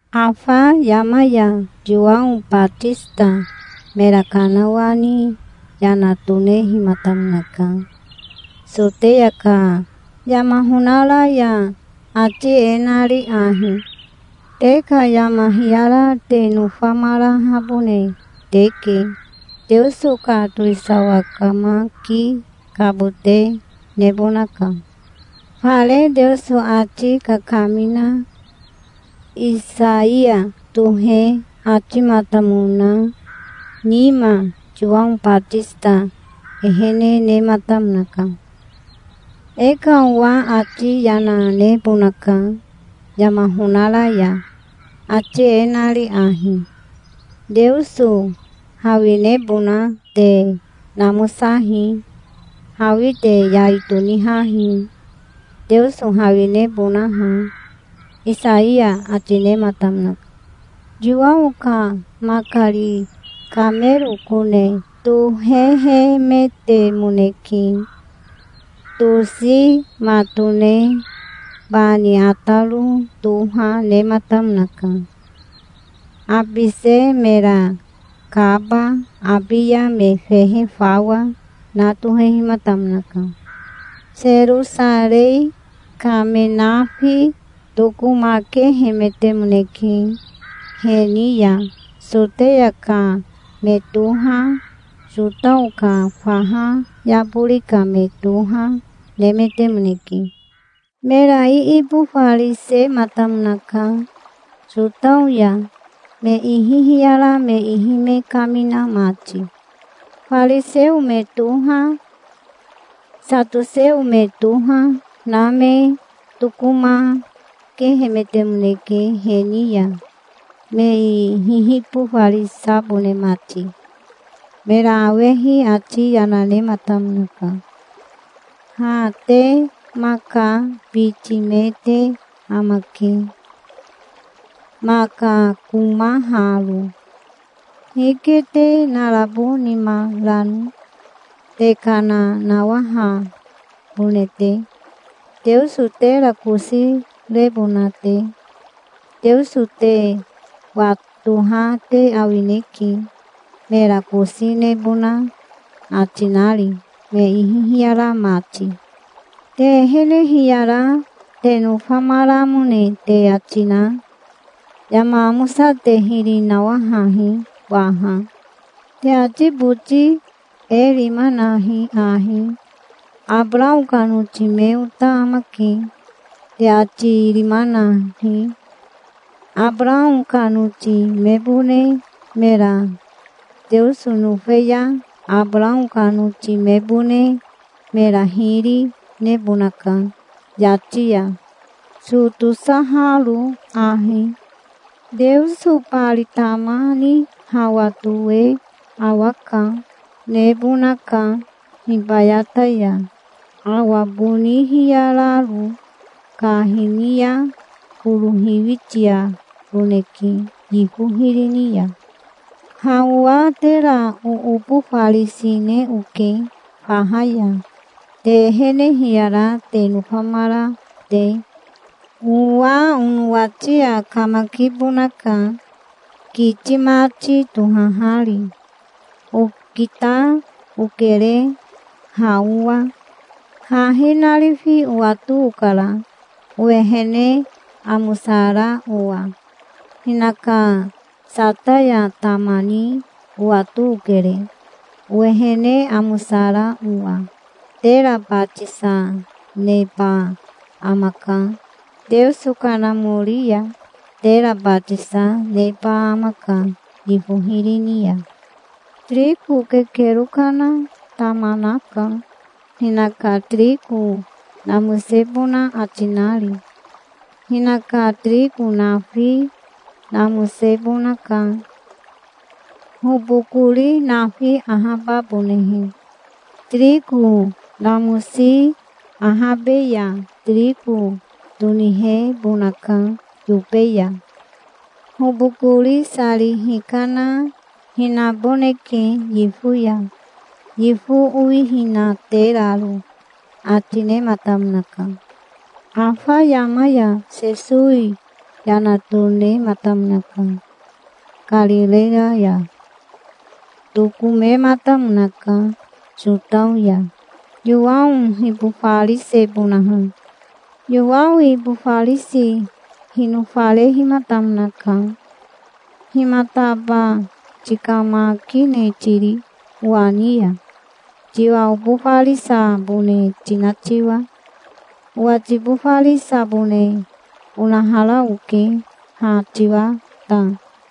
Afa yama ya Yowao Batisita mera kanawani yana tonehimatamonaka, Soteya ka yama honara ya, ati e nari ahi: "Te ka yama hiyara te nofamarahabone teke. Teoso ka towisawa kamakikabote nebonaka". Fare Teoso ati kakamina Isaiya tohe atimatamona nima Yowao Batisita ehene nematamonaka. "E ka owa ati yana nebonaka yama honara ya, ati e nari ahi: 'Teoso hawinebona te namosahi. Hawi te yai tonihahi, Teoso hawinebonaha'", Isaiya ati nematamonaka. Yowao ka makari kamero kone tohehemetemoneke. Tosi matone bani ataro toha nematamonaka. Habise mera kaba, abiya me fehe fawa, na tohehimatamonaka. Serosarei ka me nafi tokomakehemetemoneke he ni ya. Soteya ka me toha, Sotao ka faha yabori ka me toha, nemetemoneke. Mera iibofarisematamonaka Sotao ya, me ihi hiyara me ihi me kamina mati. Fariseo me toha, satoseo me toha na me tokomakehemetemoneke he ni ya, me hihibofarisabone mati. Mera awehi ati yana nematamonaka. "Ha te maka biti me te amake, maka komaharo. Hike te narabo nima rano, te kana nawahabone te, Teoso tera kosi rebona te? Teoso te watoha te awineke, mera kosi nebona ati nari, me ihi hiyara mati. Te ehene hiyara te nofamaramone te ati na, yama amosa te hiri nawahahi waha. Te ati boti e rima nahi ahi: 'Abarao ka noti me ota amake', te ati rima nahi. Abarao ka noti mebone mera Teoso nofe ya Abarao ka noti mebone mera hiri nebonaka yati ya, so tosaharo ahi. Teoso bari tama ni hawa toe awa ka nebonaka hibayata ya, awa boni hiyararo. Ka hini ya koro hiwitiaboneke yifo hiri ni ya. Ha owa tera oobofarisine oke faha ya, te ehene hiyara te nofamara te. Owa onowati ya kamakibonaka, kiti mati tohahari. Okita okere, ha owa. Hahi narifi owato okara, owehene amosara owa. Hinaka sataya tama ni owato okere, owehene amosara owa. Tera batisa neba amaka Teoso Kanamori ya. Tera batisa, neba amaka yifo hiri ni ya. Tiriko kekero kana tama naka, hinaka tiriko namosebona ati nari. Hinaka tiriko nafi namosebonaka, hobokori nafi ahababonehe. Tiriko namosi ahabe ya tiriko tonihebonaka yobe ya. Hobokori sari hikana hinaboneke yifo ya, yifo owihinateraro", ati nematamonaka. Afa yama ya Sesowi yana tonematamonaka Karireya ya. Tokomematamonaka Sotao ya, Yowao hibofarisebonaha. Yowao ibofarisi hinofarehimatamonaka. "Himataba tikamakine tiri owa ni ya, tiwa obofarisabone tina tiwa? Owa tibofarisabone onahara oke, ha tiwa ta".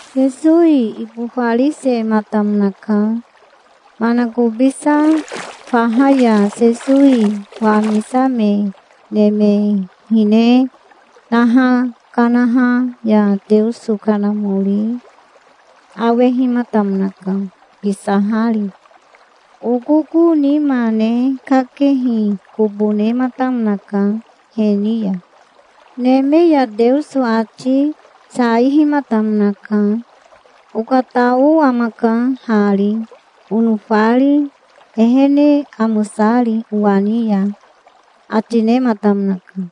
Sesowi ibofarisematamonaka. Manakobisa faha ya Sesowi wamisame neme hine naha kanaha ya Teoso Kanamori awehimatamonaka kisahari. Okoko nima ne kakehi kobo nematamonaka he ni ya. Neme ya Teoso ati saihimatamonaka. "Okatao amaka hari, onofari, ehene amosari owa ni ya", ati nematamonaka.